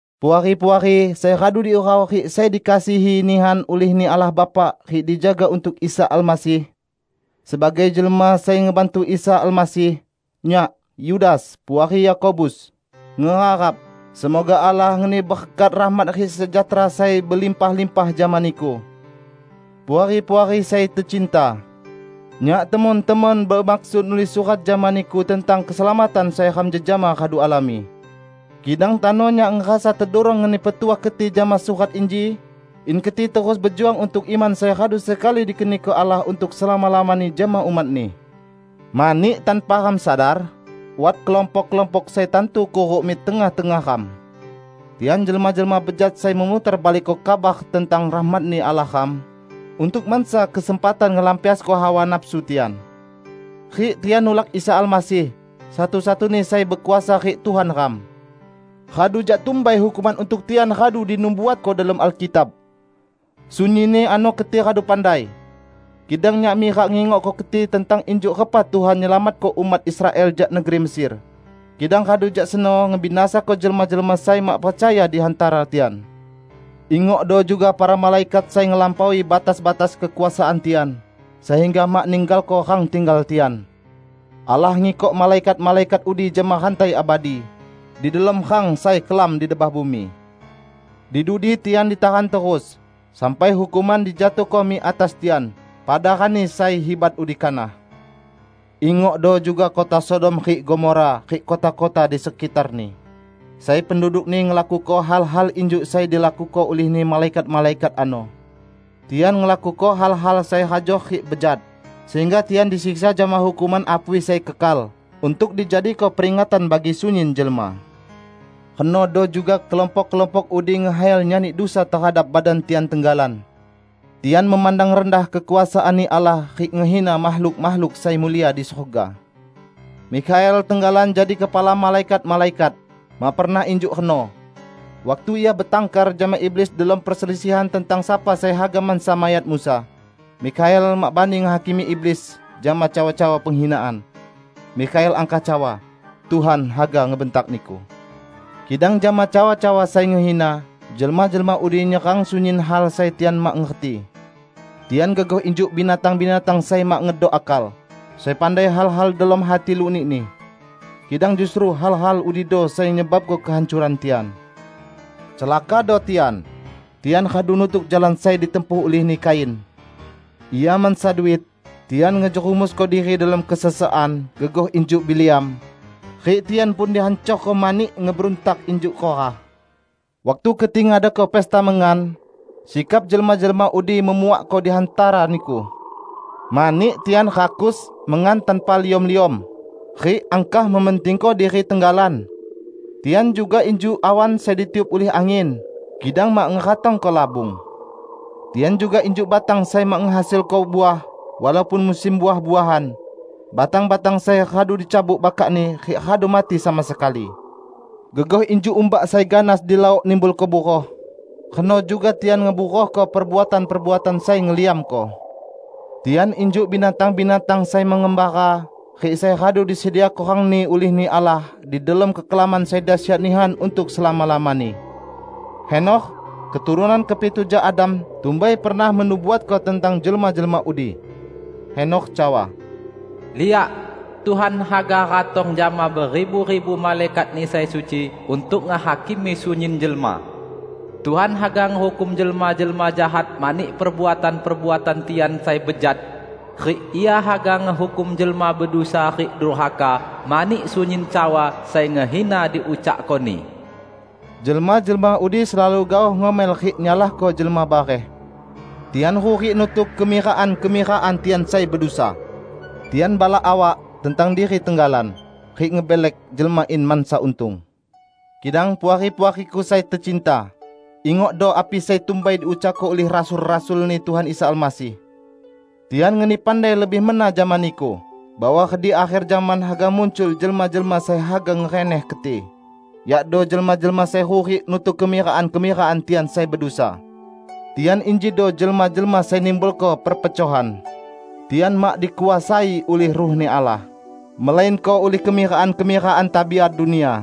Puari-puari sai radu diurau rik sai dikasihi nihan ulih-Ni Allah Bapa rik dijaga untuk Isa Almasih. Sebagai jelma sai ngebantu Isa Almasih, nyak -- Yudas -- puari Yakobus, ngeharap: Semoga Allah ngeni berkat, rahmat rik sejahtera sai belimpah-limpah jama niku. Puari-puari sai tecinta! Nyak temon-temon bemaksud nulis surat jama niku tentang keselamatan sai ram jejama radu alami. Kidang tano nyak ngerasa tedurong ngeni petuah keti jama surat inji in keti terus bejuang untuk iman sai radu sekali dikeniko Allah untuk selama-lamani jama umat-Ni. Mani tanpa ram sadar, wat kelompok-kelompok sai tantu kuruk mik tengah-tengah ram. Tian jelma-jelma bejat sai memutarbalikko kabar tentang rahmat-Ni Allah ram, untuk masa kesempatan ngelampiasko hawa nafsu tian. Rik tian nulak Isa Almasih, satu-satuni Sai Bekuasa rik Tuhan ram. Radu jak tumbai hukuman untuk tian radu dinubuatko delom Alkitab. Sunyinni ano keti radu pandai. Kidang nyak mirak ngingokko keti tentang injuk repa Tuhan nyelamatko umat Israel jak negeri Mesir, kidang radu jak seno ngebinasako jelma-jelma sai mak percaya di hantara tian. Ingokdo juga para malaikat sai ngelampaui batas-batas kekuasaan tian, sehingga mak ninggalko rang tinggal tian. Allah ngikok malaikat-malaikat udi jama rantai abadi, di delom rang sai kelam di debah bumi. Di dudi tian ditahan terus sampai hukuman dijatuhko mik atas tian pada Rani sai hibat udi kanah. Ingokdo juga kota Sodom rik Gomora rik kota-kota di sekitarni, sai pendudukni ngelakuko hal-hal injuk sai dilakuko ulihni malaikat-malaikat ano. Tian ngelakuko hal-hal sai hajor rik bejat, sehingga tian disiksa jama hukuman apui sai kekal, untuk dijadiko peringatan bagi sunyin jelma. Renodo juga kelompok-kelompok udi ngekhayal nyani dusa tehadap badan tian tenggalan. Tian memandang rendah kekuasaan-Ni Allah rik ngehina makhluk-makhluk sai mulia di surga. Mikhael tenggalan jadi kepala malaikat-malaikat, mak pernah injuk reno. Waktu ia betangkar jama iblis delom perselisihan tentang sapa sai haga mansa mayat Musa, Mikhael mak bani ngehakimi iblis jama cawa-cawa penghinaan. Mikhael angkah cawa, "Tuhan haga ngebentak niku!" Kidang jama cawa-cawa sai ngehina, jelma-jelma udi nyerang sunyin hal sai tian mak ngerti. Tian gegoh injuk binatang-binatang sai mak ngedok akal, sai pandai hal-hal delom hati lunikni. Kidang justru hal-hal udido sai nyebabko kehancoran tian. Celakado tian! Tian radu nutuk jalan sai ditempuh ulihni Kain. Ia mansa duit, tian ngejerumusko diri delom kesesekan, gegoh injuk Bileam. Rik tian pun dihancorko mani ngeberuntak injuk Korah. Waktu keti ngadako pesta mengan, sikap jelma-jelma udi memuakko di hantara niku. Mani tian rakus mengan tanpa liom-liom, rik angkah mementingko diri tenggalan. Tian juga injuk awan sai ditiup ulih angin, kidang mak ngeratongko labung. Tian juga injuk batang sai mak ngehasilko uah walaupun musim uah-uahan, batang-batang sai radu dicabut bakakni rik radu mati sama sekali. Gegoh injuk umbak sai ganas di laok nimbulko buroh, reno juga tian ngeburohko perbuatan-perbuatan sai ngeliamko. Tian injuk binatang-binatang sai mengembara rik sai radu disediako rangni ulih-Ni Allah di delom kekelaman sai dasyat nihan untuk selama-lamani. Henokh, keturunan kepitu jak Adam, tumbai pernah menubuatko tentang jelma-jelma udi. Henokh cawa, "Liak, Tuhan haga ratong jama beribu-ribu malaikat-Ni sai suci untuk ngehakimi sunyin jelma. Tuhan haga ngehukum jelma-jelma jahat mani perbuatan-perbuatan tian sai bejat. Rik Ia haga ngehukum jelma bedusa rik durhaka mani sunyin cawa sai ngehina diucakkoni." Jelma-jelma udi selalu gaoh ngomel rik nyalahko jelma bareh. Tian hurik nutuk kemirakan-kemirakan tian sai bedusa. Tian balak awak tentang diri tenggalan, rik ngebelek jelma in mansa untung. Kidang Puari-puariku sai tecinta, ingokdo api sai tumbai diucakko ulih rasul-rasul-Ni Tuhan Isa Almasih. Tian ngeni pandai lebih mena jama niku bahwa redik akher zaman haga muncul jelma-jelma sai haga ngereneh keti, yakdo jelma-jelma sai hurik nutuk kemirakan-kemirakan tian sai bedusa. Tian injido jelma-jelma sai nimbulko perpecohan. Tian mak dikuasai ulih Ruh-Ni Allah, melainko ulih kemirakan-kemirakan tabiat dunia.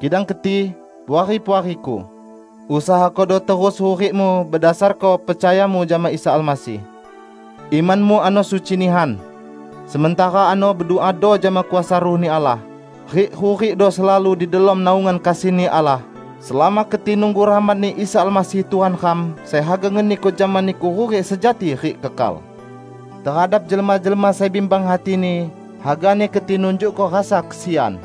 Kidang keti, Puari-puariku, usahakodo terus hurikmu bedasarko percayamu jama Isa Almasih. Imanmu ano suci nihan. Sementara ano beduado jama kuasa Ruh-Ni Allah, rik hurikdo selalu di delom naungan kasih-Ni Allah selama keti nunggu rahmat-Ni Isa Almasih Tuhan ram, sai haga ngeniko jama niku hurik sejati rik kekal. Tehadap jelma-jelma sai bimbang hatini, hagani keti nunjukko rasa kesian.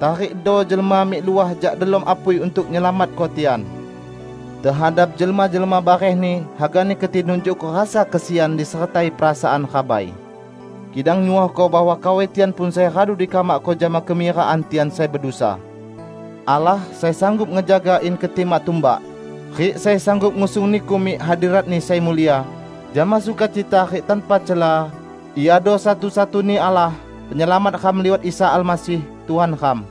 Tarikdo jelma mik luah jak delom apui untuk nyelamatko tian. Tehadap jelma-jelma barehni hagani keti nunjukko rasa kesian disertai perasaan rabai, kidang nyuohko bahwa kawai tian pun sai radu dikamakko jama kemirakan tian sai bedusa. Allah, sai sanggup ngejaga in keti mak tumbak, rik sai sanggup ngusung niku mik hadirat-Ni sai mulia jama sukacita rik tanpa cela, Iado satu-satuni Allah, Penyelamat ram liwat Isa Almasih Tuhan ram.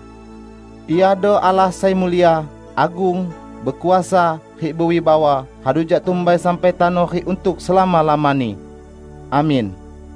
Iado Allah sai mulia, agung, bekuasa rik bewibawa radu jak tumbai sampai tano rik untuk selama-lamani! Amin.